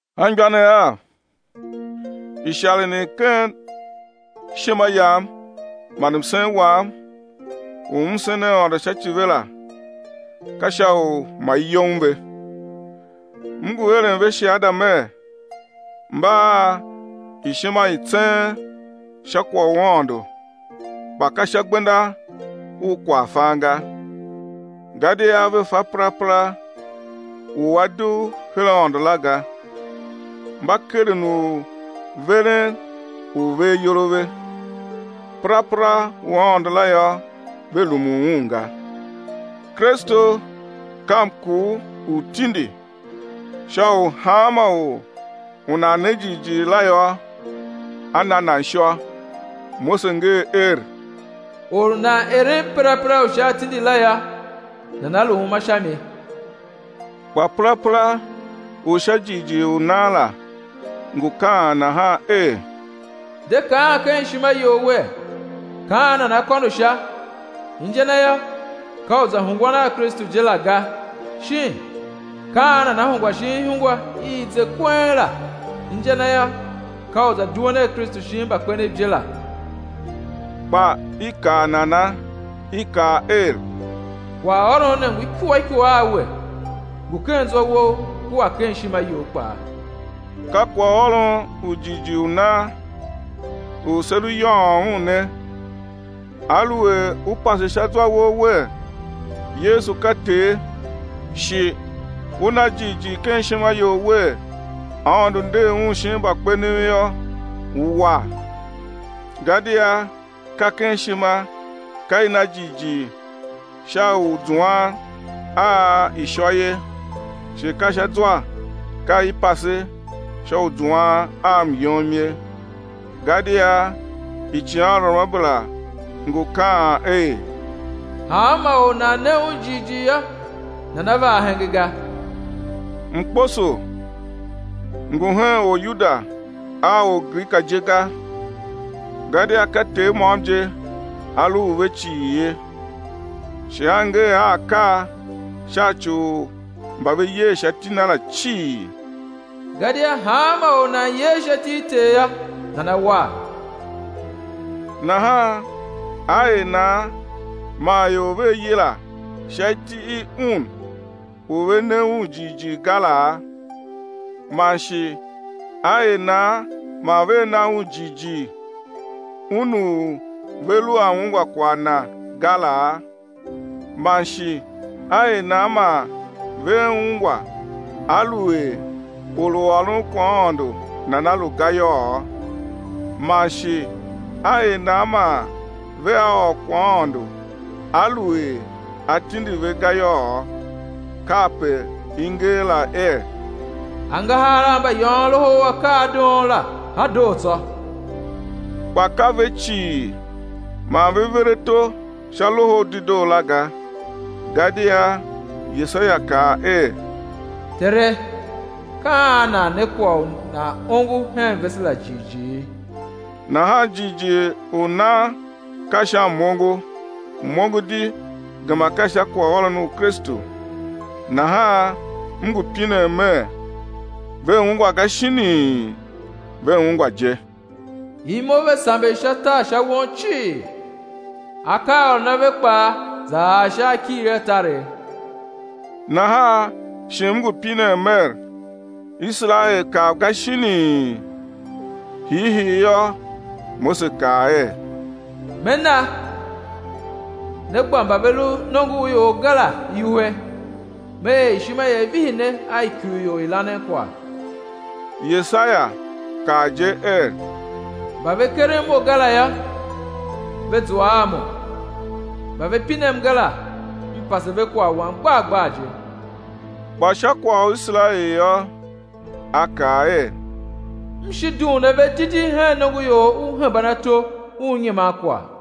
Anmgbianev av, isharen i ken ishima yam man msen wam u m sen Aôndo sha ci ve la, ka sha u ma i yem ve. M ngu eren ve shiada mer, mba a ishima i tseen sha kwagh u Aôndo kpa ka sha gbenda u kwaghfan ga. Gadia ve fa perapera u a dugh her Aôndo la ga, mba keren u veren u ve ayol a ve. Perapera u Aôndo la yô, ve rumun un ga. Kristu ka mkur u tindi sha u hanma or u nan ne jighjigh la yô, á na nan ishô. Mose nger er: Or u nan eren perapera u sha atindi la yô, nana lu uma sha mi. Kpa perapera u sha jighjigh u nan la ngu kaan nahan er: De kaan ken ishima you wer: Ka an nana kôndo Sha, inja na yô, ka u za hungwan a Kristu je la, ga; shin: Ka an nana hungwa shin ihungwa i i ze kweng la, inja na yô, ka u za duen a Kristu shin mbakpenev je la. Kpa i kaa nana? I kaa er: Kwaghôron ne ngu ikua ikua a we, ngu ken zwa wou kua ken ishima you kpaa. Ka kwaghôron u jighjigh u nan u se lu yôôn un ne: Aluer u pase sha zwa wou wer, Yesu ka Ter, shi u na jighjigh ken ishima you wer, Aôndo nder Un shin mbakpenev yô, ú war. Gadia ka ken ishima ka i na jighjigh sha u zuan a ishô ye, shi ka sha zwa ka i pase sha u zuan a myom ye. Gadia icighanruamabera ngu kaan er: Hanma or u nan ne Un jighjigh yô, nana va ahenga ga. Mkposo ngu hen Oryuda a Orgrika je ga, gadia ka Ter môm je A lu u ve cii ye, shi A ngee a akaa sha ci u mba ve yer sha iti Na la cii. Gadia hanma or u nan yer sha iti i Ter yô, nana war. Nahan á er nan man ior vea yila sha iti i Un u ve ne Un jighjigh ga laa? Man shi á er nan man vea na Un jighjigh, Un u ve lu a ungwa kwagh Na ga laa? Man shi á er nan man vea ungwa aluer or u ôron kwaghaôndo nana lu ga yôô? Man shi á er nan man vea ôr kwaghaôndo aluer a tindi ve ga yôô? Kape i nger la er: Angahar a mbayôôn loho u akaadoon la a doo tsô! Kpa ka ve cii man ve ver ato sha Loho u Dedoo la ga. Gadia Yesaia kaa er: Tere, ka an nan ne kwagh u nan ongo hen vese la jighjigh? Nahan jighjigh u nan ka sha m-ongo, m-ongo di gema ka sha kwaghôron u Kristu. Nahan m ngu pinen mer: Ve ungwa ga shinii? Ve ungwa je: Imo ve samber sha tar sha won cii, akaaôron a ve kpaa za ar sha akighir a taregh. Nahan shi m ngu pinen mer: Iserael kav ga shinii? Hiihii yô, Mose kaa er: Me na, né gba mba ve lu nongo u ior ga la iwuhe, Me er ishima ia vihi ne a ikurior i lanen kwagh. Yesaia kaa je er: Mba ve keren Mo ga la yô, ve zua a Mo, mba ve pinem ga la M pase ve kwagh Wam gbar gbar je. Kpa sha kwagh u Iserael yô, a kaa er: M shi dughun ave didi hen nongoior u hemban ato u nyiman kwagh.